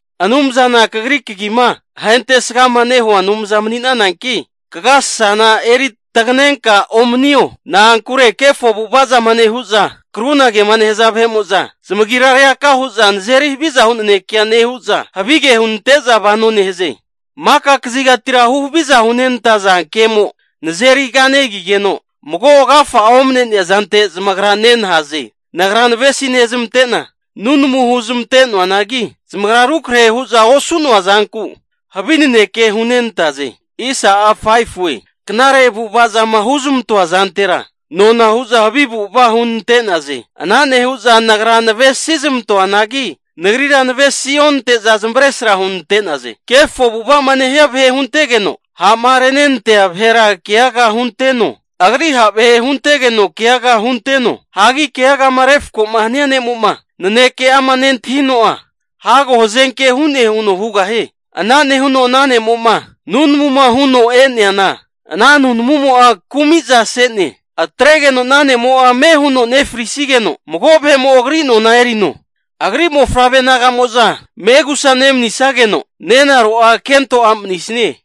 Anumzana kagri kagima ahentesgama nehua Anumza mani'nananki, kagasasana eri taganenka omanio. Na'ankure kefo avu'ava'zama nehu'za krunagema nehaza vahe'mo'za, zamagira reaka hu'za nazeri haviza hu nanekea nehu'za, havige hunante'za vano nehaze. Maka kazigatira huhaviza hunenantaza kemo nazeri kanegigeno, mago agafa'a omane'nea zante zamagra nenahaze. Nagra navesi nezmante'na, nunamu huzmante noanagi, zamagra rukrahe hu'za osu'noa zanku havi naneke hunante'naze. Knare avu'ava zama huzmantoa zantera, nona hu'za havi avu'ava hunante'naze. Ana nehu'za nagra navesi zmantoanagi, nagrira navesi onante'za zamavesra hunante'naze. Kefo avu'ava'ma nehia vahe huntegeno ha'ma renenantea vahera keaga hunteno, Agri ha' vahe huntegeno keaga hunteno. Hagi keaga'ama refko hania ne'mo'ma naneke'ama nentahino'a, hago hazenke hu'ne huno hugahie. Ana nehuno ana ne'mo'ma nunamuma huno e'neana, ana nunamumo'a kumizase'ne. Atregeno ana ne'mo'a ame huno nefrisigeno, mago vahe'mo agri nona eri'noe. Agri mofavre naga'mo'za megusa nemanisageno, nenaro'a kento a' manisanie.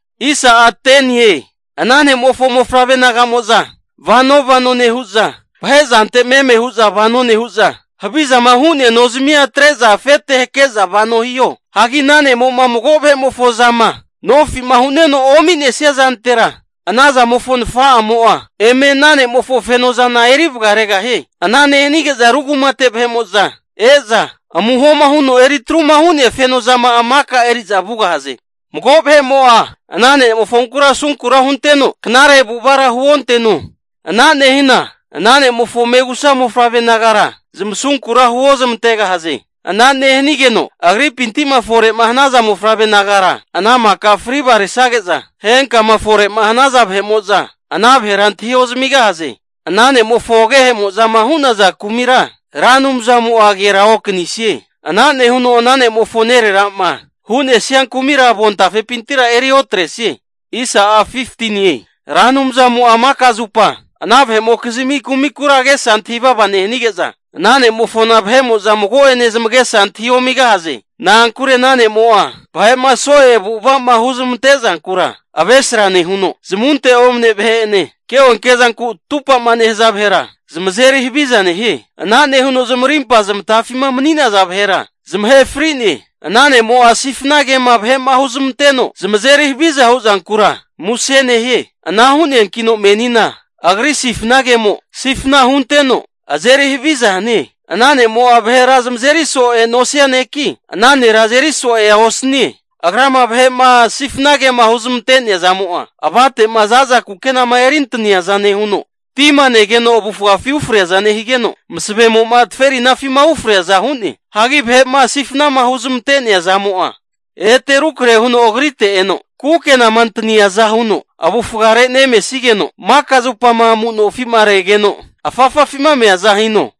Ana ne'mofo mofavre naga'mo'za vano vano nehu'za, vahe zante meme hu'za vano nehu'za, havizama hu'nea nozamia atre'za afete hake'za vano hiho. Hagi ana ne'mo'ma mago vahe'mofo zama nofi'ma hu'neno omi'nesia zantera, anazamofo nafa'amo'a eme ana ne'mofo fenozana eri vagaregahie. Ana nehanige'za ru kumate vahe'mo'za e'za, amuhoma huno eri atruma hu'nea feno zama'a maka eri'za vugahaze. Mago vahe'mo'a ana ne'mofonkura asunkura hunteno knare avu'avara huonteno. Ana nehina ana ne'mofo megusa mofavre nagara zamasunkura huozmantegahaze! Ana nehanigeno agripinti'ma fore'ma hanaza mofavre nagara ana maka fri vagaresage'za, henkama fore'ma hanaza vahe'mo'za ana vahera antahi ozamigahaze. Ana ne'mofo agehemo'zama hu'naza kumira Ra Anumzamo'a aganera okanisie. Ana nehuno ana ne'mofo nerera'ma hu'nesia kumira avontafepintira eri otresie. Ra Anumzamo'a maka zupa ana vahe'mokizmi kumikura agesa antahi vava nehanige'za, ana ne'mofona vahe'mo'za mago'ene zamagesa antahi omigahaze. Na'ankure ana ne'mo'a vahe'ma so'e avu'ava'ma huzmante zankura avesra nehuno, zamunte omane vahe'ene ke'onke zanku atupama nehaza vahera zamazeri haviza nehie. Ana nehuno zamarimpa zamatafima mani'naza vahera zamahe fri'ne. Ana ne'mo'a sifana kema vahe'ma huzmanteno zamazeri haviza hu zankura muse nehie. Ana hu'neanki menina agri sifna kemo sifna hunteno azeri haviza hanie. Ana ne'mo'a vahera zamazeri so'ea nosia neki, ana nera azeri so'ea osanie. Agrama vahe'ma sifna kema huzmantea zamo'a, avate'ma za'za kukenama eri antaniaza nehuno, tima negeno avufgafi ufreaza nehigeno, masavemo'ma zaferinafima ufreaza hu'ne. Hagi vahe'ma sifnama huzmante'nea zamo'a ete rukrahe huno agrite eno, kukenama antaniaza huno avufgare nemesigeno, maka zupama amu nofi'ma regeno afafafima meaza hino.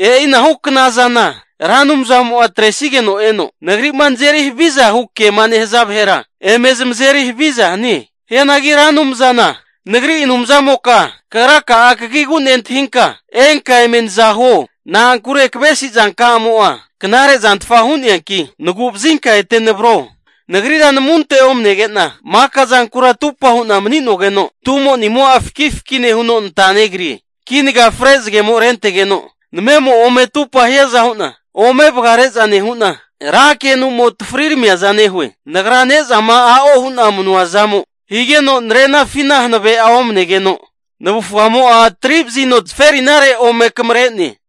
E'inahu knazana Ra Anumzamo'a atresigeno eno, nagri'ma nazeri haviza hu kema nehaza vahera eme zamazeri haviza hanie. Hianagi Ra Anumzana nagri Anumzamoka, kagraka'a kagigu nentahinka, enka eme naza huo. Na'ankure kavesi zankamo'a knare zantfa hu'neanki, nagu'vazinka ete navro. Nagrira namunte omanege'na, maka zankura atupa hu'na mani'nogeno, tumo'nimo'a fakifaki nehuno nata negrie. Kinaga fre zagemo rentegeno namemo ome atupa hiaza hu'na, ome vagare'za nehu'na, ra kenu'mo atafari ramiaza nehue. Nagra ne'zama a'o hu'na manua zamo higeno narenafina hanave'a nomanegeno, navufgamo'a tari'vazino zaferinare ome akamare'ne.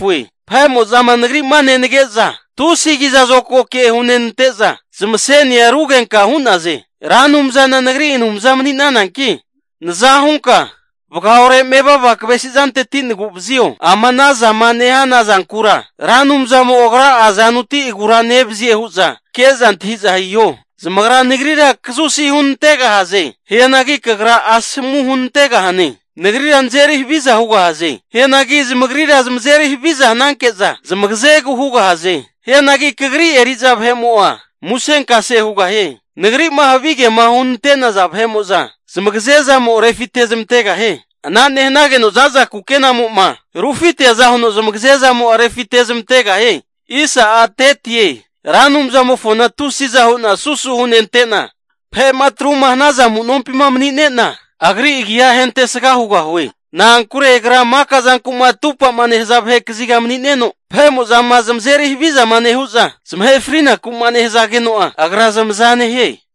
Vahe'mo'zama nagri'ma nenage'za tusi kizazokago ke hunenante'za, zamasenia rugenka hu'naze. Ra Anumzana nagri Anumza mani'nananki naza hunka, vagaore mevava kavesi zanteti nagu'vazio. Ama ana zama nehana zankura, Ra Anumzamo Agra'a azanuti agura nevazie hu'za ke'za antahi'za hiho. Zamagra nagrira kazusi hunantegahaze. Hianagi kagra asomu hunantegahane. Nagrira nazeri haviza hugahaze. Hianagi zamagrira zamazeri haviza hananke'za zamagazegu hugahaze. Hianagi kagri eri'za vahe'mo'a musenkase hugahie. Nagri'ma havigema hunante'naza vahe'mo'za zmagazezamo'a refitezmantegahie. Ana nehanageno za'za kukenamo'ma rufiteaza huno zamagazemo'a refitezmantegahie. Ra Anumzamofona tusiza hu'na susu hunente'na, vahe'ma atruma hanaza amu'nompima mani'nena, agri agi'a ahentesga hugahue. Na'ankure Agra maka zanku'ma atupa'ma nehaza vahe kaziga mani'neno, vahe'mo'zama zamazeri havizama nehu'za zamahe frinaku'ma nehazageno'a Agra zamaza nehie.